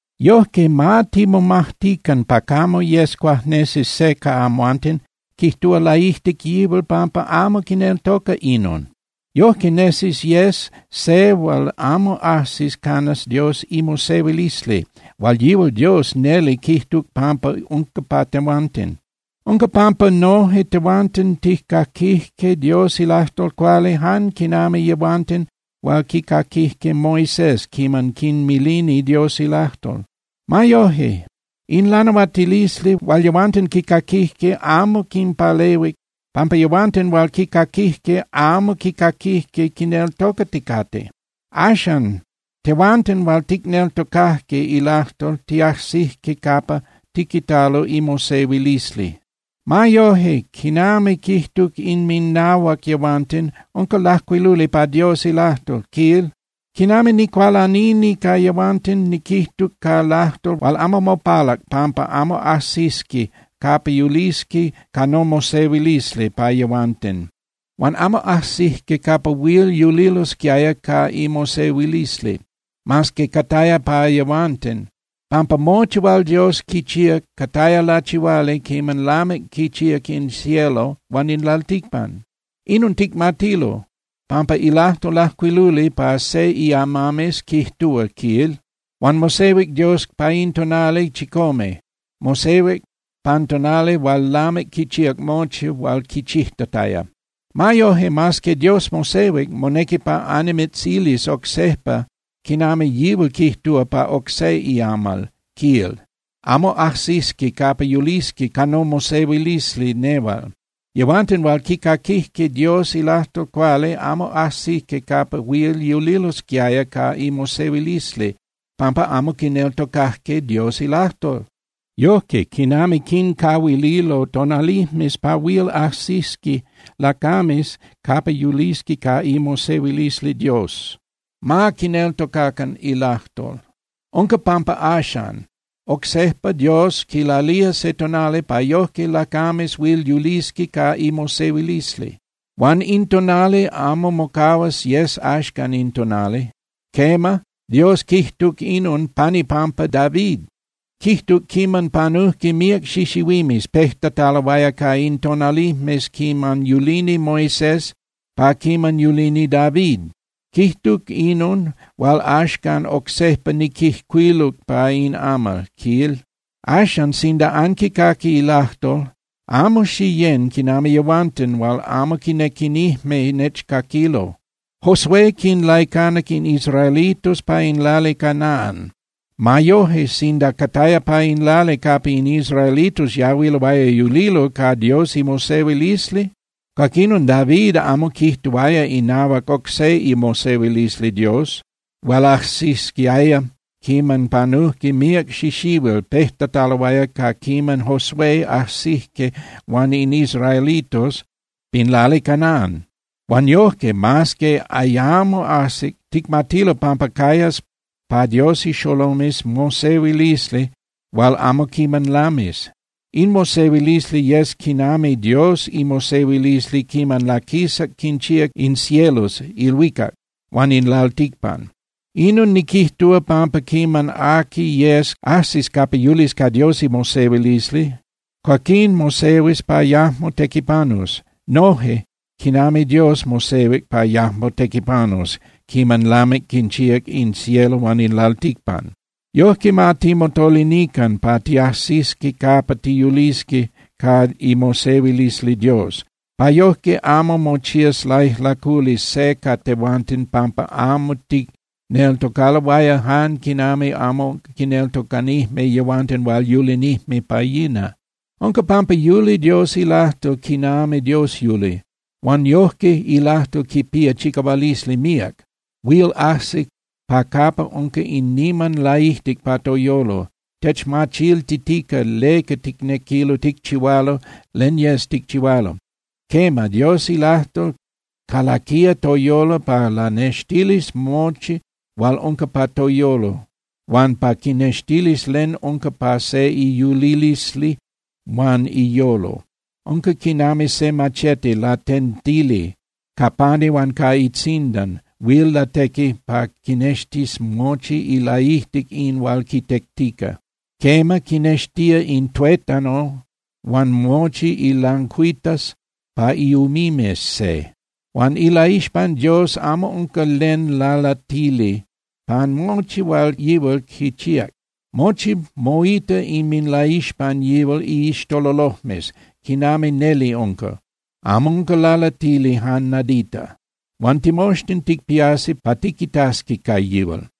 Yojque, ma timomajtican pa camo yes cuajnesi se ca amhuanten quijtúa laijtic yihual pampa amo quineltoca inon. Yojque nesis yes se hual amo ajsis canas Dios imosehuilisli hual yihual Dios neli quijtuc pampa unca pa tehuanten. Unca pampa noje tehuanten tijcaquijque Dios ilajtol cuali jan quinami yehuanten hual quicaquijque Moisés quiman quinmilini Dios ilajtol. Ma yoje, in lanahuatilisli hual yehuanten quicaquijque amo quinpalehuic, pampa yehuanten hual quicaquijque amo quicaquijque quineltocaticate. Axan, tehuanten hual ticneltocajque ilajtol tiajsijque capa tiquitalo imosehuilisli. Ma yoje, quinami quijtuc inminahuac yehuanten, unca lajcuiluli pa Dios ilajtol, quil: Quinami nicualanini ca yehuanten, niquijtuc ca lajtol hual amo mopalac pampa amo ajsisqui capa yulisqui ca nomosehuilisli pa yehuanten. Huan amo ajsijque capa huil yulilosquiaya ca imosehuilisli, mas que cataya pa yehuanten, pampa mochi hual Dios quichíac cataya lachihuali quiman lamic quinchíac in cielo huan in lalticpan. Inon ticmatilo, pampa ilajtol lajcuiluli pa se iamames quijtúa, quil: Huan mosehuic Dios pa in tonali chicome, mosehuic pan tonali hual lamic quichíac mochi hual quichijtataya. Ma yoje, mas que Dios mosehuic, monequi pa annimitzilis oc sejpa quinami yihual quijtúa pa oc se iamal, quil: Amo ajsisqui capa yulisqui ca nomosehuilisli nehual. Yehuanten hual quicaquijque Dios ilajtol cuali amo ajsijque capa huil yulilosquiaya ca imosehuilisli, pampa amo quineltocajque Dios ilajtol. Yojque, quinami quincahuililo tonalijmes pa huil ajsisqui lacames capa yulisqui ca imosehuilisli Dios, ma quineltocacan ilajtol. Unca pampa axan, oc sejpa Dios quilalía se tonali pa yojque lacames huil yulisqui ca imosehuilisli. Huan in tonali amo mocahuas yes axcan in tonali. Quema, Dios quijtuc inon pan ipampa David. Quijtuc quiman panujque míac xixihuimes pejtataloaya ca in tonalijmes quiman yulini Moisés pa quiman yulini David. Quijtuc inon hual axcan oc sejpa niquijcuiluc pa in amal, quil: Axan, sinda anquicaqui ilajtol, amo xiyén quinami yehuanten hual amo quinequinijme nechcaquilo. Josué quinlaicanac in israelitos pa in lali Canaan. Ma yoje, sinda cataya pa in lali capa in israelitos yahuiloaya yulilo ca Dios imosehuilisli, cuaquinon David amo quijtuaya inahuac oc se imosehuilisli Dios hual ajsisquiaya quiman panujque míac xixihuil pejtataloaya ca quiman Josué ajsijque huan in israelitos pin lali Canaan. Huan yojque, mas que ayamo ajsic, ticmatilo pampa cayas pa Dios ixolomes mosehuilisli hual amo quiman lamis. In mosehuilisli yes quinami Dios imosehuilisli quiman laquisac quinchíac in cielos (ilhuicac) huan in lalticpan. Inon niquijtúa, pampa quiman aqui yes ajsis capa yulis ca Dios imosehuilisli, cuaquín mosehuis pa yajmo tequipanus, noje quinami Dios mosehuic pa yajmo tequipanus quiman lamic quinchíac in cielo huan in lalticpan. Yojque, ma timotolinican pa tiajsisqui capa tiyulisqui ca imosehuilisli Dios, pa yojque amo mochías laijlaculi se ca tehuanten pampa amo ticneltocaloaya jan quinami amo quineltocanijme yehuanten hual yulinijme pa yina. Unca pampa yuli Dios ilajtol quinami Dios yuli, huan yojque ilajtol quipía chicahualisli míac, huil ajsi pa capa unca in niman laijtic pa toyolo, techmachiltitica leca ticnequilo ticchihualo len yes ticchihualo. Quema, Dios ilajtol calaquía toyolo pa lanextilis mochi hual unca pa toyolo huan pa quinextilis len unca pa se iyulilisli huan iyolo. Unca quinami se machete latentili ca pani huan ca itzindan huil latequi pa quinextis mochi ilaijtic in hual quitectica. Quema, quinextía in tuétano huan mochi ilancuitas pa iumimes se. Huan ilaixpan Dios amo unca len lalatili pan mochi hual yihual quichíac. Mochi moita inminlaixpan yihual iixtololojmes quinami neli unca, amo unca lalatili jan nadita. Huan timoxtin ticpiasi pa tiquitasqui ca yihual.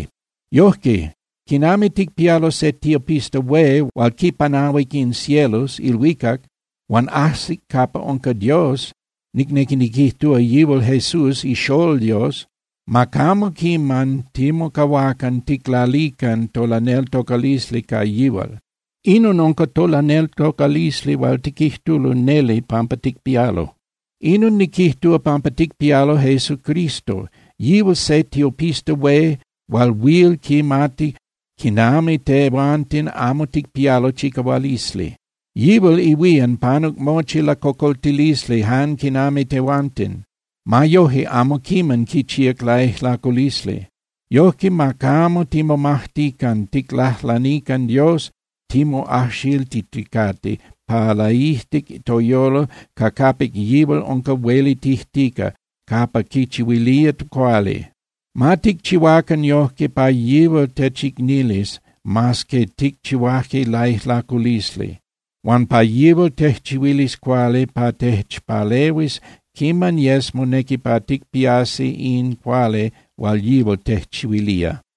Yojque, quinami ticpialo se tiopista hué hual quipanahuic in cielos (ilhuicac) huan ajsic capa unca Dios, nicnequi niquijtúa, yihual Jesús iXolol Dios, ma camo quiman timocahuacan ticlalican tolaneltocalisli ca yihual. Inon unca tolaneltocalisli hual tiquijtulo neli pampa ticpialo. Inon niquijtúa pampa ticpialo Jesucristo, yihual se tiopista hué hual huil quimati quinami tehuanten amo ticpialo chicahualisli. Yihual ihuían panuc mochi lacocoltilisli jan quinami tehuanten. Ma yoje amo quiman quichíac laijlaculisli. Yojque, ma camo timomajtican ticlajlanican Dios timoajxiltiticate pa laijtic toyolo ca capic yihual unca huelitijtica capa quichihuilía cuali. Ma ticchihuacan yojque pa yihual techicnilis mas que ticchihuaje laijlaculisli, huan pa yihual tejchihuilis cuali pa techpalehuis quiman yes monequi pa ticpiasqui in cuali hual yihual tejchihuilía.